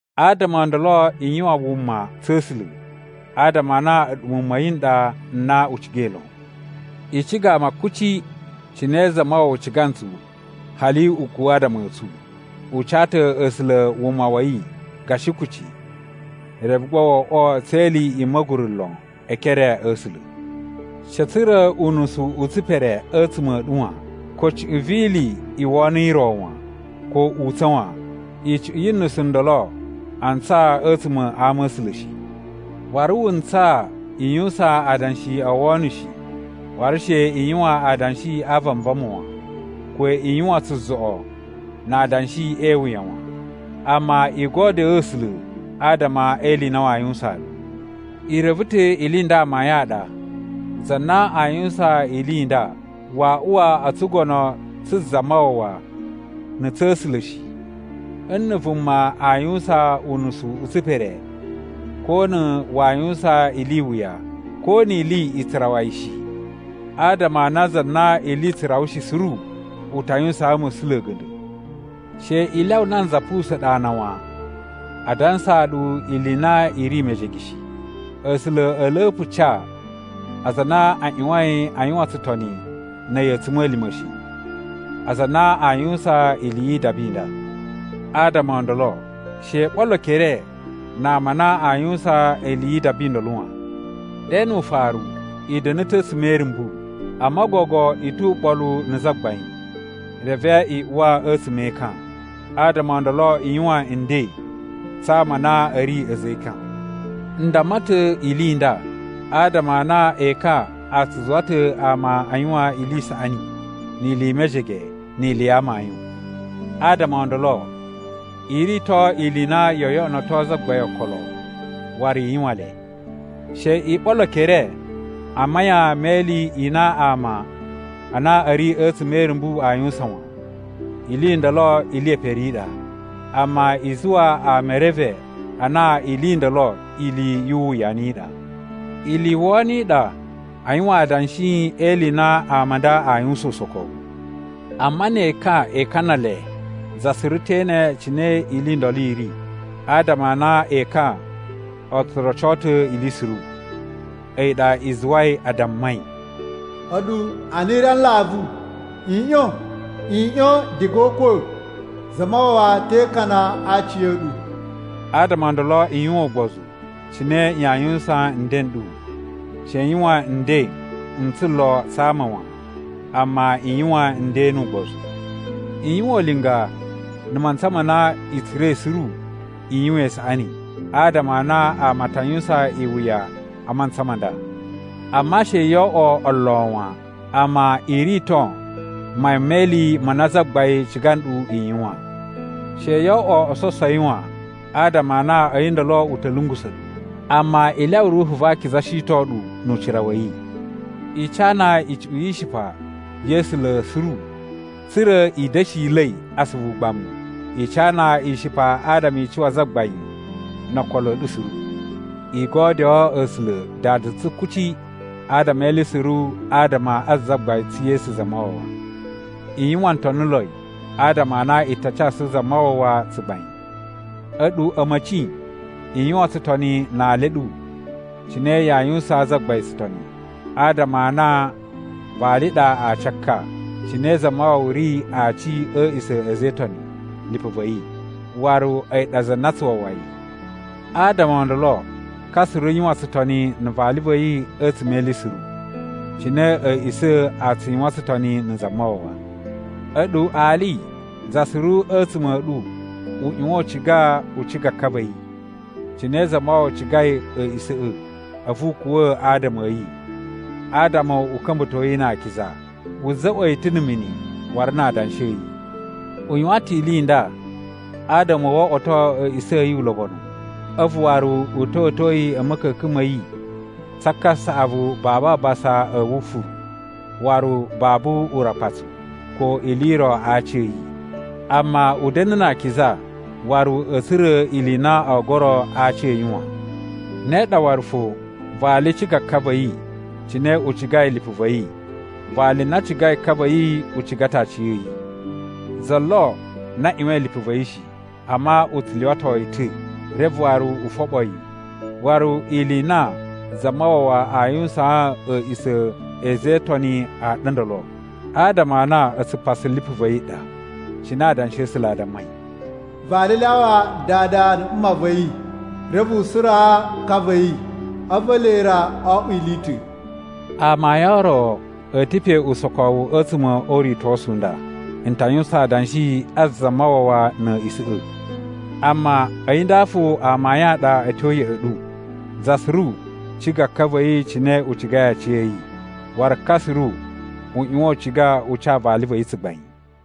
Adama o ndolo i yuwan wuma tsa̱ A̱sula̱, adama a na a̱ɗu muwun ma̱ yi n ɗa n na u cigai lon. I ciga ama kuci, cine Zamawawa ciga ntsu, hali u kuwa̱ adama a̱ tsu. U ca ta̱ A̱sula̱ wuma wa̱ yi gashi kucci, reve gba wo oꞌwo tse ili i ma̱guru lon e ekere a̱ A̱sula̱. She a̱ tsura̱ unusu u tsipere a̱tsuma̱ a̱ ɗu wan, ko cuꞌun vi ili i wono i ro wan, ko utsa̱n wan. Icuꞌun yu nusu ndolo a ntsaa a̱tsuma̱ a ama a̱ A̱sula̱ shi. Waru wu ntsaa i yuwusan adanshi o wono shi, waru she i yuwan adanshi a vanvama wan, ko i yuwan tsuzoꞌo na adanshi e iwuya wan. Amma i godyo A̱sula̱ adama e ili i na waa yuwusaan ɗu. I reve ta̱ ili i nda amayun a ɗa za na a yuwusan ili i nda waa uwa o tsugono tsu Zamawawa na̱ tsa̱ A̱sula̱ shi: nna̱ vuma aa yuwusan unusu u tsipere, ko na̱ waa yuwusan ili i wuya, ko ni ili i tsu rawa yi shi, adama a na za na ili i tsu rawa shi suru u ta yuwusaan ma̱sula̱ a̱ga̱nda̱. She i lyawa nanza pusa̱a̱n ɗu ana wan, a dansaa ɗu ili i na i ri mejege shi. A̱sula̱ a̱a̱ la̱pa̱ ca aza a na a ꞌyuwain a yuwan tsutoni na̱ a̱yi a̱tsuma̱lima̱ shi, aza a na a yuwusan ili yi idaba i nda. Adama o ndolo, she i ɓolo ekere na ama a na aa yuwusan ili yi idaba i ndolo wan. Ɗe nu ufaru, i da̱na̱ ta̱ a̱tsuma̱ e irumbu, amma gogo i tu uɓolu na̱ Zagbain, reve i uwa a̱tsuma̱ e ekan. Adama o ndolo i yuwan nden tsa ama a na a̱ ri a̱za̱ e ekan. N damma ta̱ ili i nda adama a na ekan a tsu zuwa ta̱ ama a yuwan ili i saꞌani, ni ili i mejege, ni ili ya amayun. Adama o ndolo, i rito ili i na yoo yoꞌonoto Zagbain okolo waru i yuwan le. She i ɓolo ekere a mayan me ili i na ama a na a̱ ri a̱tsuma̱ e irumbu aa yuwusan wan. Ili i ndolo ili ye pere i ɗa. Amma, i zuwa ama e reve a na ili i ndolo ili yu uwuyanu i ɗa. Ili i wono i ɗa a yuwan adanshi e ili i na ama a nda a yuwusan usokowu. Amma ne ekan e ikana le, za suru te ene cine ili i ndolo i ri, adama a na ekan o tsu roco ta̱ ili suru. A̱yi ɗa i zuwai a dammai, “A̱ɗu a na i ri a nlavu, i ꞌyon! I ꞌyon diga o ukwa̱, Zamawawa te ikana a aci a̱ ɗu.” Adama o ndolo i yuwan ugbozu cine yaa yuwusan nden n ɗu. She i yuwan nden n tsulo tsa ama wan, amma i yuwan nden nu ugbozu. I yuwan ulinga na̱ mantsa ma na i tsura̱i suru i yuwan isaꞌani, adama a na ama a ta yuwusan iwuya a mantsa ma nda. Amma she yo oꞌwo olo wan, amma i rito mayan me ili ma na Zagbain ciga nɗu i yuwan. She yoo oꞌwo ososowi wan, adama a na a̱yi ndolo u ta̱ lungusa̱ ɗu. Amma i lyawa Ruhu va Akiza shiton ɗu nu ucira wa̱ yi. I cana icuꞌun yi ishipa ya̱ A̱sula̱ suru tsa̱ra̱ i da̱shila̱i asuvu ugbamu. I cana ishipa adama i cuwa Zagbain no okolo a̱ ɗu suru. I godyoo A̱sula̱ Dada tsu kuci adama e ili suru adama a Zagbain tsu Yesu Zamawawa. I yuwan ntoniloi, adama a na i ta casu Zamawawa tsugbain. A̱ɗu a̱ma̱ci, i yuwan tsutoni na ali a̱ ɗu cine yaa yuwusaan Zagbain tsutoni, adama a na vali ɗa aci a ka, cine Zamawawa ri Aci a̱ a̱a̱ꞌisa̱ a̱ a̱za̱ e Itoni, lipu va̱ yi. Waru a̱yi ɗa za na tsu wawa yi. Adama o ndolo, ka suru yuwan tsutoni na̱ vali va̱ yi a̱tsuma̱ e ili suru, cine a̱ a̱a̱ꞌisa̱ꞌa̱ a tsu yuwan tsutoni na̱ Zamawawa. A̱ɗu ali, za suru a̱tsuma̱ a̱ ɗu u ꞌyuwan u ciga u ciga ka va̱ yi, cine Zamawawa cigai a̱a̱ꞌisa̱ꞌa̱, a̱vu u kuwa̱ adama a̱ yi adama u ka̱mba̱to yi na akiza. Wu za̱ꞌwa̱ yi ta̱ na̱ mini waru na adanshi a̱ yi. U yuwan ta̱ ili i nda adama wo oꞌwoto a̱a̱ꞌisa̱ a̱ yi ulobonu, a̱vu waru u ta̱wa̱to yi a̱ ma̱ka̱ka̱n ma̱ yi tsa kasaꞌavu babu abasa a̱ wufuru, waru babu urakpatsu ko ili i ro a aci a̱ yi. Amma, u da̱na̱ na akiza waru a̱ tsura̱ ili i na o goro a aci a̱ yi wan. Ne ɗa waru fo, vali ciga ka va̱ yi, cine u cigai lipu va̱ yi. Vali na cigai ka va̱ yi u ciga ta̱ aciya̱yi. Za lo na ꞌyuwain lipu va̱ yi shi, amma u tsu lyuwato yi ta̱, reve waru u foɓo yi. Waru ili i na Zamawawa a yuwusaan a̱a̱ꞌisa̱ a̱ a̱za̱ e Itoni a ɗa ndolo, adama a na a̱tsu pasu lipu va̱ yi ɗa. Cine Adanshi a̱ A̱sula̱ a dammai, “Vali lyawa dada na̱ mma va̱ yi, reve u suraa ka va̱ yi a̱vu ele ra o oꞌwo ili i ta̱.” Amayun o ro a̱ ta̱ pe usokowu a̱tsuma̱ o uritosu u nda. N ta yuwusan adanshi a Zamawawa na̱ a̱a̱ꞌisa̱ꞌa̱. Amma a̱yi nda fo amayun a ɗa a̱ tyo ya̱ꞌa̱ ɗu: za suru ciga ka va̱ yi cine u cigai aciya̱yi, waru ka suru u ꞌyuwan u ciga u ca vali va̱ yi tsugbain.